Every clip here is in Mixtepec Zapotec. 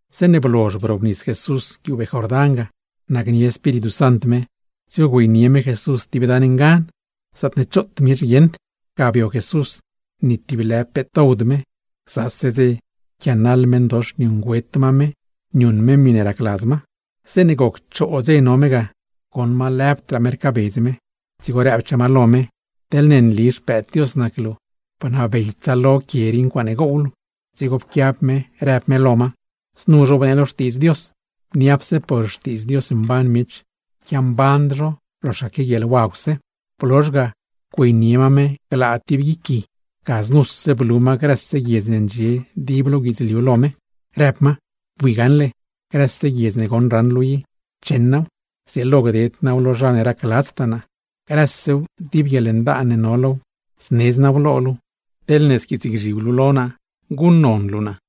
Zeeṉe blozh brobnis Jesús guiubee Jordán ga, nacnie Espíritu Sant me, dzigo güeynie me Jesús tib dan ngan, zaatne choot miech guieṉd. Ga bio Jesús, ni tib lë peet dowd me; gzase dze pquianaḻ meṉdox niuṉgüet ma me niuṉ me miṉe racladz ma. Zeeṉe goc choo dze no me ga, goṉ ma lëbdraa me rcaabedz me, dzigo rëbchaa ma lo me: ―Teḻne nli Xpëëd Dios nac luu, bnabey tsaalo grë quie rii ncuaaṉe gow luu. Dzigo pquiab me rëb me lo ma: ―Znu zhobnee lo Xtiidz Dios: “Niapse por xtiidz Dios mban miech, yquiamband zho loxaque guieḻwagwse.” Blozh ga güeynie ma me glaa tib guic gui, ga znuse blu ma grëse guiedz ne ndxie dib lo guidzliu lo me, rëb ma: ―Bui gaṉle, grëse guiedz ne goṉ raṉ luu i, cheṉ naaw, zrieelo gded naaw lo zha ne racladztaa naa. Grësew, dib guieḻndaan ne no low, znedz naaw lo luu teḻne squiitsgzhib luu lo naa, guṉnon luu naa.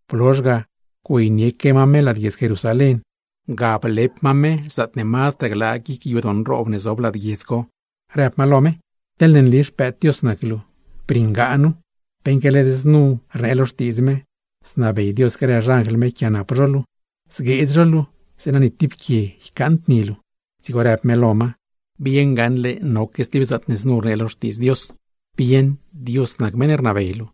Blozh ga güeynieque ma me lad guiedz Jerusalén, ga blep ma me zaatne mazdraa glaa guic yadoo nroob ne zob lad guiedz co, rëb ma lo me: ―Teḻne nli Xpëëd Dios nac luu, briṉgaa nu, beṉque led znu rnee lo Xtiidz me: “Znabey Dios grë xanjl me yquiaanap luu, zgueedz zho luu, zeeṉa ni tib quie ycaaṉd ni luu.” Dzigo rëb me lo ma: ―Psoladz gaṉle noque stib zaatne znu rnee lo Xtiidz Dios: “Bieṉ, Dios nac meṉ ne rnabey luu,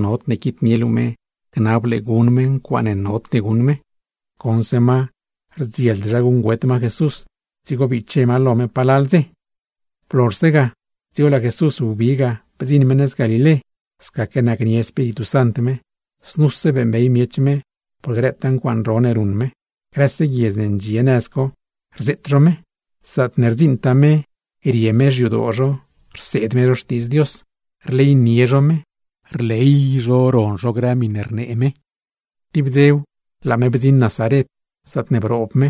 nodne quitnie luu me gnab luu lo me guṉ me ncuaaṉe nod guṉ me.” Goṉse ma rdzield zha guṉgüet ma Jesús, dzigo biche ma lo me palal dze. Blozhse ga, dzigo laa Jesús wbi ga bdziṉ me nëz Galilé, scaque nacnie Espíritu Sant me. Znuse beeṉbey miech me por grëtaa ncuaaṉ ro ne ruṉ me, grëse guiedz ne ndxie nëz co, rzeet zho me. Zaatne rdziṉtaa me, rie me xyadoo zho, rseed me zho Xtiidz Dios, rleynie zho me, rley zho ron zho grë miṉe rnee me. Tib dzew, laa me bdziṉ Nazaret, zaatne broob me.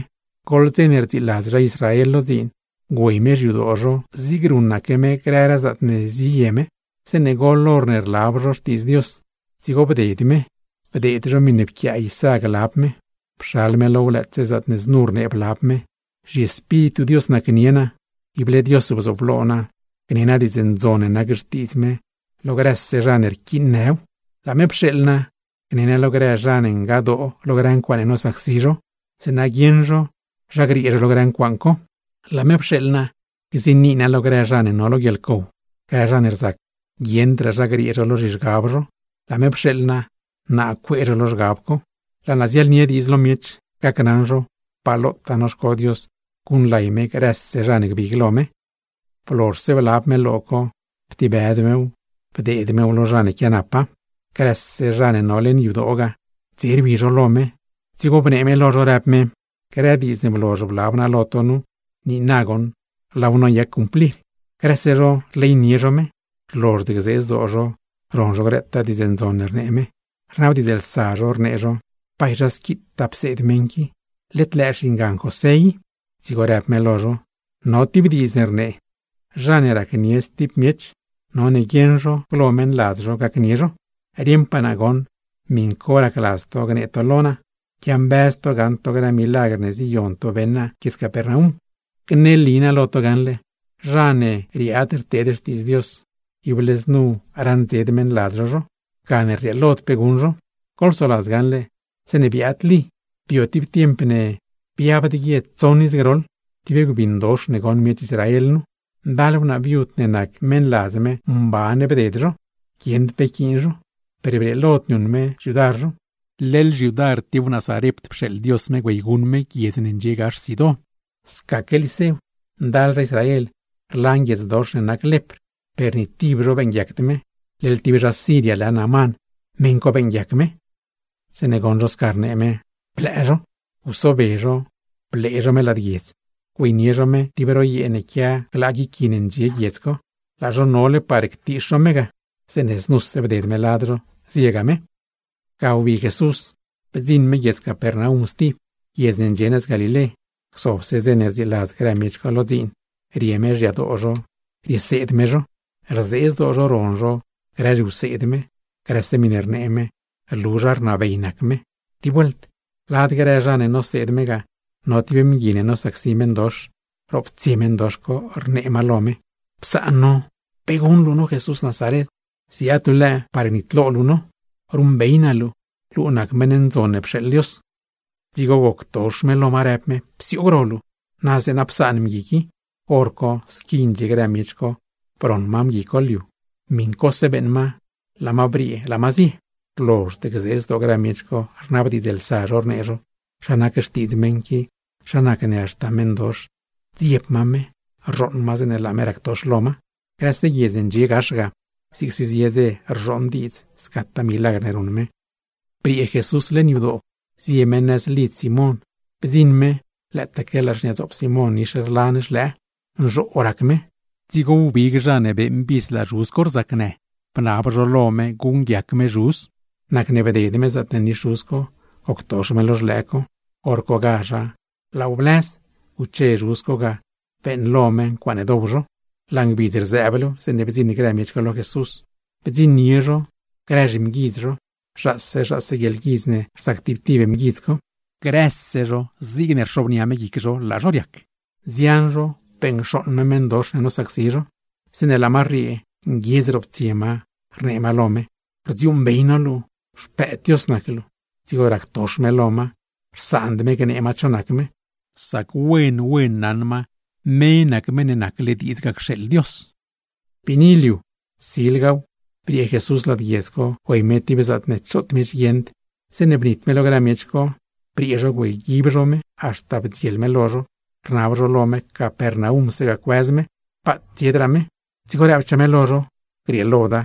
Goḻ dze ne rdziiladz zha Israel lo dziin, güey me xyadoo zho zig ruṉaque me grëraa zaatne ziye me. Zeeṉe goḻ horne rlab zho Xtiidz Dios, dzigo bded me, bdeed zho miṉe pquiaa Isá glab me. Pxal me low, lëëtse zaatne znu rnee blab me: ZhiEspíritu Dios nacnie naa, ible Dios bzooblo naa, gnee naa Diidz Ndzon ne nac xtiidz me lo grëse zha ne rquiinnëw. Laa me pxeeḻ naa gne naa lo grë zha ne ngadoo lo ncuaaṉe nosacsi zho, zeeṉa guieṉ zho zha griee zho lo grë ncuaaṉ co. Laa me pxeeḻ naa gziini naa lo grë zha ne no lo guieḻcow, grë zha ne rzac guieṉdraa zha griee zho lo zhizhgab zho, laa me pxeeḻ naa, naa cuee zho lo zhgab co. Laa naa ziaḻnie diidz lo miech, gacnaṉ zho pa lotaa noxco Dios guṉlay me grëse zha ne gbig lo me. Blozhse blab me lo co, ptibëd mew bdeed mew lo zha ne quianapa, dzigo laa me bzob. Grëse zha ne no leṉ yadoo ga, dze rwi zho lo me, dzigo bnee me lo zho, rëb me: ―Grë diidz ne blozh blab naa lo to nu, leṉ dze rii goṉ laaw noyac cumplir. Grëse zho rleynie zho me, rlozhd gzee zdoo zho ron zho grëtaa diidz ndzon ne rnee me. Rnabdiidzlsa zho rnee zho: ―¿Bay zha squitaa pseed meṉ qui? ¡Led lëë xingan José i! Dzigo rëb me lo zho: ―No tib diidz ne rnee: “Zha ne racnie stib miech, none guieṉ zho glo meṉladz zho gacnie zho.” Rieṉpaa naa goṉ, miṉ co racladz to gnë to lo naa; quiambëz to gaṉ to grë milagr ne ziyon to beṉ naa guiedz Capernaum. ’Gneli naa lo to gaṉle: Zha ne riaad rteed xtiidz Dios, ible znu raṉdzed meṉladz zho zho; gane rrieelod pe guṉ zho. Goḻsoladz gaṉle zeeṉe biaad Lí, bio tib tiemp ne biabd guie tsoṉ iz groḻ, tib gbindox ne goṉ miech Israel nu. Ndal wnaa viud ne nac meṉladz me mban bded zho, guieṉd pe nquiin zho, per brieelod niuṉ me xyudar zho; leḻ xyudar tib wnaa Sarept pxeeḻ Dios me güeyguṉ me, guiedz ne ndxie gax Sidón. Scaque zeeṉe biaad Liséw, ndal zha Israel rlan guiedzdox ne nac lepr, per ni tib zho beeṉguiacd me; leḻ tib zha Siria lë Naamán, meṉ co beeṉguiac me. Zeeṉe goṉ zho sca rnee me, blëë zho. Gusobe zho, blee zho me lad guiedz, güeynie zho me tib ro yee ne quia glaa guic gui ne ndxie guiedz co. Laa zho nole par ctiix zho me ga, zeeṉe znuse bded me lad zho, ziega me. Ga wbi Jesús, bdziṉ me guiedz Capernaum stib, guiedz ne ndxie nëz Galilé. Gzobse dze ne rdziiladz grë miech co lo dziin, rie me xyadoo zho rieseed me zho. Rzee zdoo zho ron zho grë zhiwseed me, grëse miṉe rnee me, rlu zha rnabey nac me. Tib vuelt, lad grë zha ne noseed me ga no tib mgui ne nosacsi meṉdox; roptsie meṉdox co rnee ma lo me: ―¡Psaan no! ¿Pe guṉ luu no Jesús Nazaren? ¿Ziaad luu lëë par gnitlo luu no? ¡Ruṉbey naa luu, luu nac meṉ ndzon ne pxeeḻ Dios! Dzigo goctox me lo ma, rëb me: ―¡Psioog ro luu! ¡Na zeeṉa psaan meṉ qui! Horco, squi ndxie grë miech co broṉ ma mgui co liu, miṉcose beeṉ ma, laa ma briee laa ma zie. Rlozhd gzee zdoo grë miech co, rnabdiidzlsa zho rnee zho: ―¿Zha nac xtiidz meṉ qui, zha nacne haxta meṉdox rdzieb ma me, rzhooṉ ma zeeṉe laa me ractox lo ma? Grëse guiedz ne ndxie gax ga, zigse zie dze rzhooṉ diidz scataa milagr ne ruṉ me. Briee Jesús leṉ yadoo, zie me nëz lidz Simón. Bdziṉ me lëëtaque laa xniadzoop Simón nix rlan xlëë, nzhoo rac me; dzigo wbig zha ne beeṉ vis laa zhuz co rzacnë, bnab zho lo me guṉguiac me me. Nacne bded me zaatne nix zhuz co, goctox me lo xlëë co. Horcogazha laaw blëz, guche zhuz co ga, beeṉlo me ncuaaṉe dow zho. Laa ngbidz rzëëblew, zeeṉe bdziṉ grë miech co lo Jesús, bdziṉnie zho grë zhimguidz zho. Zhaase zhaase guieḻguidz ne rzac tib tib mguidz co, per grëse zho zigne rxobnia me guic zho laa zho riac. Nzian zho beṉcxooṉ me meṉdox ne nosacsi zho, zeeṉe laa ma rriee, nguiedz roptsie ma rnee ma lo me: ―¡Rdziuuṉbey no luu, Xpëëd Dios nac luu! Dzigo ractox me lo ma, rsaand me gnee ma cho nac me, sac wen wen naṉ ma me nac Meṉ ne nacle diidz ga cxeeḻ Dios. Biini liu co, silgaw briee Jesús lad guiedz co güey me tib zaatne choot miech guieṉd. Zeeṉe bnit me lo grë miech co, briee zho güeyguib zho me haxta bdziel me lo zho; rnab zho lo me Capernaumse ga cuëz me, paat tsiedraa me. Dzigo rëbchaa me lo zho: ―Grieeloda,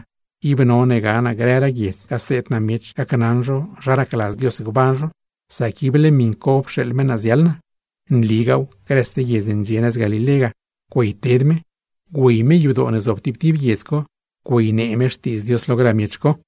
ib none ga naa grëraa guiedz, gaseed naa miech gacnaṉ zho zha racladz Dios gban zho; sac ible miṉ co pxeeḻ me naa ziaḻ naa. Nligaaw, grëse guiedz ne ndxie nëz Galilé ga güeyted me, güey me yadoo ne zob tib tib guiedz co, güeynee me Xtiidz Dios lo grë miech co.